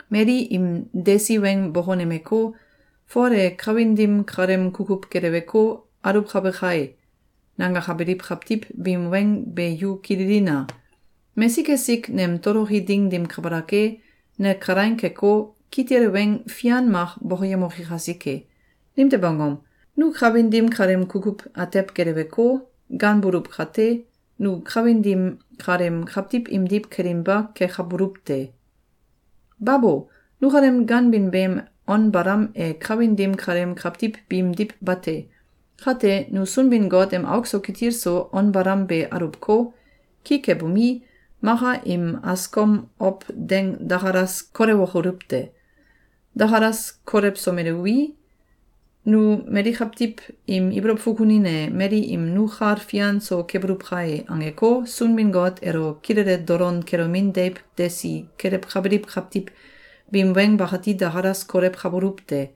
Mali im desi weng bokonemeko, “Fol e kawin dim kaleem kukuw geleweko, aluwkabe kai!”, nangakabiliw kawtiw biim weng be yu kililina! Mesik esik nem toloki ding dim kabalak e, ne kalaing keko, kitil weng fian mak bokoyemoki kasike! Nimtew angom? Nu kawin dim kaleem kukuw atew geleweko, ganbuluw kate, nu kawin dim kaleem kawtiw imdiw kelinba kekabuluw te. Babo! Nukalem ganbin beem on balam e kawin dim kaleem kawtiw biimdiw bate. Kate, nu Sunbin-Got em auk so kitil so on balam be aluwko, ki kebomi, maka im askom ow deng dakalas kolewokoluw te. Dakalas kolewsomeluwi, nu mali kawtiw im ibolow fukunin e, mali im “Nu kal fian so kebuluw kae!”, angeko, Sunbin-Got elo kilele dolon kelomin deiw desi kelewkabiliw kawtiw biim weng bakati dakalas kolewkabuluw te.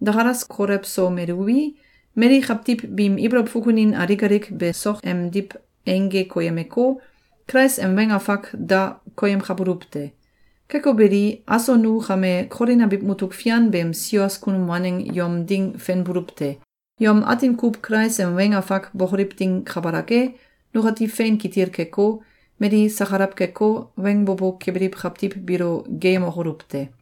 Dakalas kolewsomeluwi, mali kawtiw biim ibolow fukunin alik alik be sok emdiw eingge koyemeko, Kulais em weng afak da koyemkabuluw te. Keko beli, aso nu kame Kolin abiw mutuk fian beem sios kunum waneng yom ding fenbuluw te. Yom atin kuw Kulais em weng afak bokoliw ding kabalak e, nukati fein kitil keko, mali sakalaw keko, weng bo bo kebiliw kawtiw biilo geeyemokoluw te.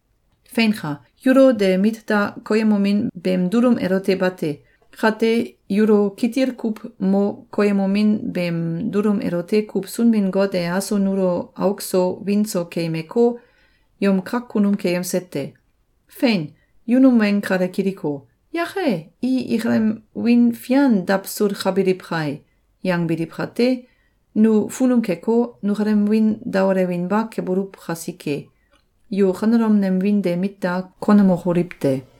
Feinka! Yulo de mit da koyemomin beem dulum elote bate. Kate, yulo kitil kuw mo koyemomin beem dulum elote kuw Sunbin-Got e aso nulo auk so wiin so keyemeko, yom kak kunum keyemse te. Fein! Yu num weng kale kiliko, “Yake! I ikalem wiin fian dawsulkabiliw kai!”, yangbiliw kate, nu funum keko, nukalem wiin daolewinba kebuluw kasike, yu kanelom nem wiin de mit da konemokoliw te!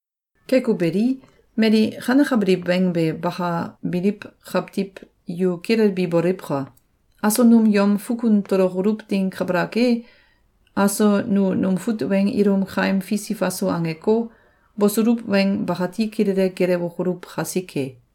Keko beli, mali kanekabiliw weng be bakabiliw kawtiw yu kilelbi boliwka! Aso num yom fukun tolokoluw ding kabalak e, aso nu num fut weng ilum kaim fisi faso angeko, bosuluw weng bakati kilele gelewokoluw kasike.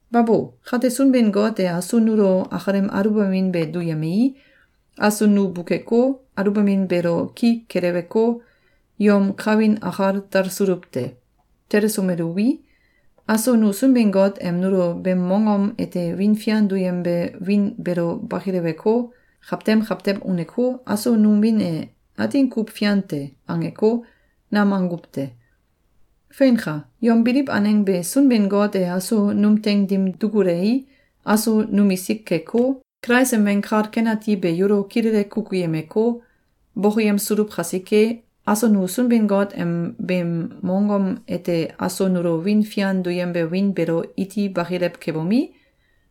Babo! Kate Sunbin-Got e aso nulo akalem aluwbamin be duyemei, aso nu bukeko, aluwbamin beelo ki keleweko, yom kawin akal talsuluw te. Telesomelwui, aso nu Sunbin-Got em nulo beem mongom ete wiin fian duyembe wiin beelo bakileweko, kawtem kawtem uneko, “Aso num wiin e atin kuw fian te!”, angeko, nam anguw te. Feinka! Yom biliw aneng be Sunbin-Got e aso num teing dim dukulei, aso numisik keko, Kulais em Weng Kal Ken Ati be yulo kilele kukuyemeko, bokoyemsuluw kasike, aso nu Sunbin-Got em beem mongom ete aso nulo wiin fian duyembe wiin beelo iti bakilew kebomi,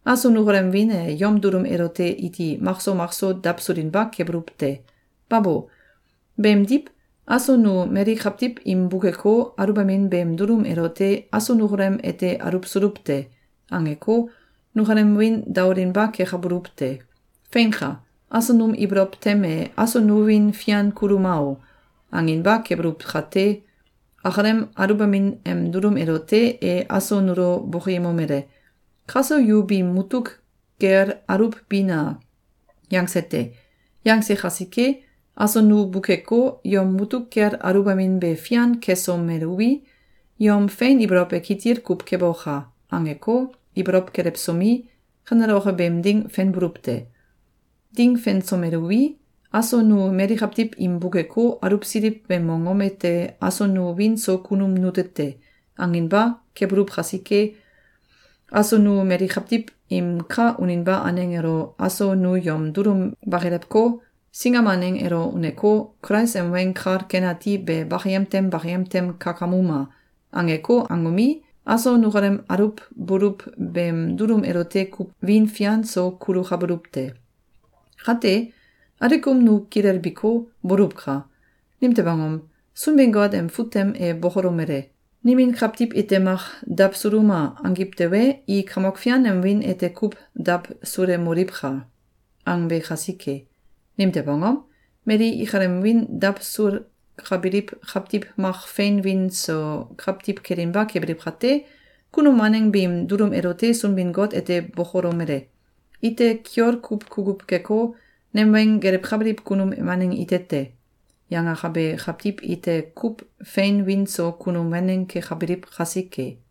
aso nukalem wiin e yom dulum elote iti makso makso dawsulinba kebuluw te. Babo! Beemdiw, aso nu mali kawtiw im bukeko, aluwbamin beem dulum elote “Aso nukalem ete aluwsuluw te!”, angeko, nukalem wiin daolinba kekabuluw te. Feinka! Aso num ibolow tem e “Aso nu wiin fian kuluma o!”, anginba kebuluw kate, “Akalem aluwbamin em dulum elote e aso nulo bokoyemomele: ‘Kaso yu biim mutuk kel aluwbina!’, yangse te. Yangse kasike, aso nu bukeko, yom mutuk kel aluwbamin be fian kesomeluwi, yom fein ibolow e kitil kuw keboka!”, angeko, ibolow kelewsomi, kaneloke beem ding fenbuluw te. Ding fensomeluwi, aso nu mali kawtiw im bukeko, aluwsiliw beem mongom ete “Aso nu wiin so kunum nute te!”, anginba kebuluw kasike, aso nu mali kawtiw im ka uninba aneng elo “Aso nu yom dulum bakilewko, singam aneng elo uneko, Kulais em Weng Kal Ken Ati be bakayem tem bakayem tem kakamuma!”, angeko angomi, aso nukalem aluwbuluw beem dulum elote kuw wiin fian so kulukabuluw te. Kate, alikum nu kilelbiko, boluwka! Nimtew angom? Sunbin-Got em fut tem e bokolomele: “Nimin kawtiw ite mak ‘Dawsuluma!’, angiw tewe, i Kamok Fian em wiin ete kuw dawsulemoliwka!”, angbe kasike. Nimtew angom? Mali ikalem wiin dawsulkabiliw kawtiw mak fein wiin so kawtiw kelinba kebiliw kate, kunum waneng biim dulum elote Sunbin-Got ete bokolomele: “Ite kiol kuw kukuw keko, nem weng gelewkabiliw kunum waneng ite te.”, yangakabe kawtiw ite kuw fein wiin so kunum waneng kekabiliw kasike.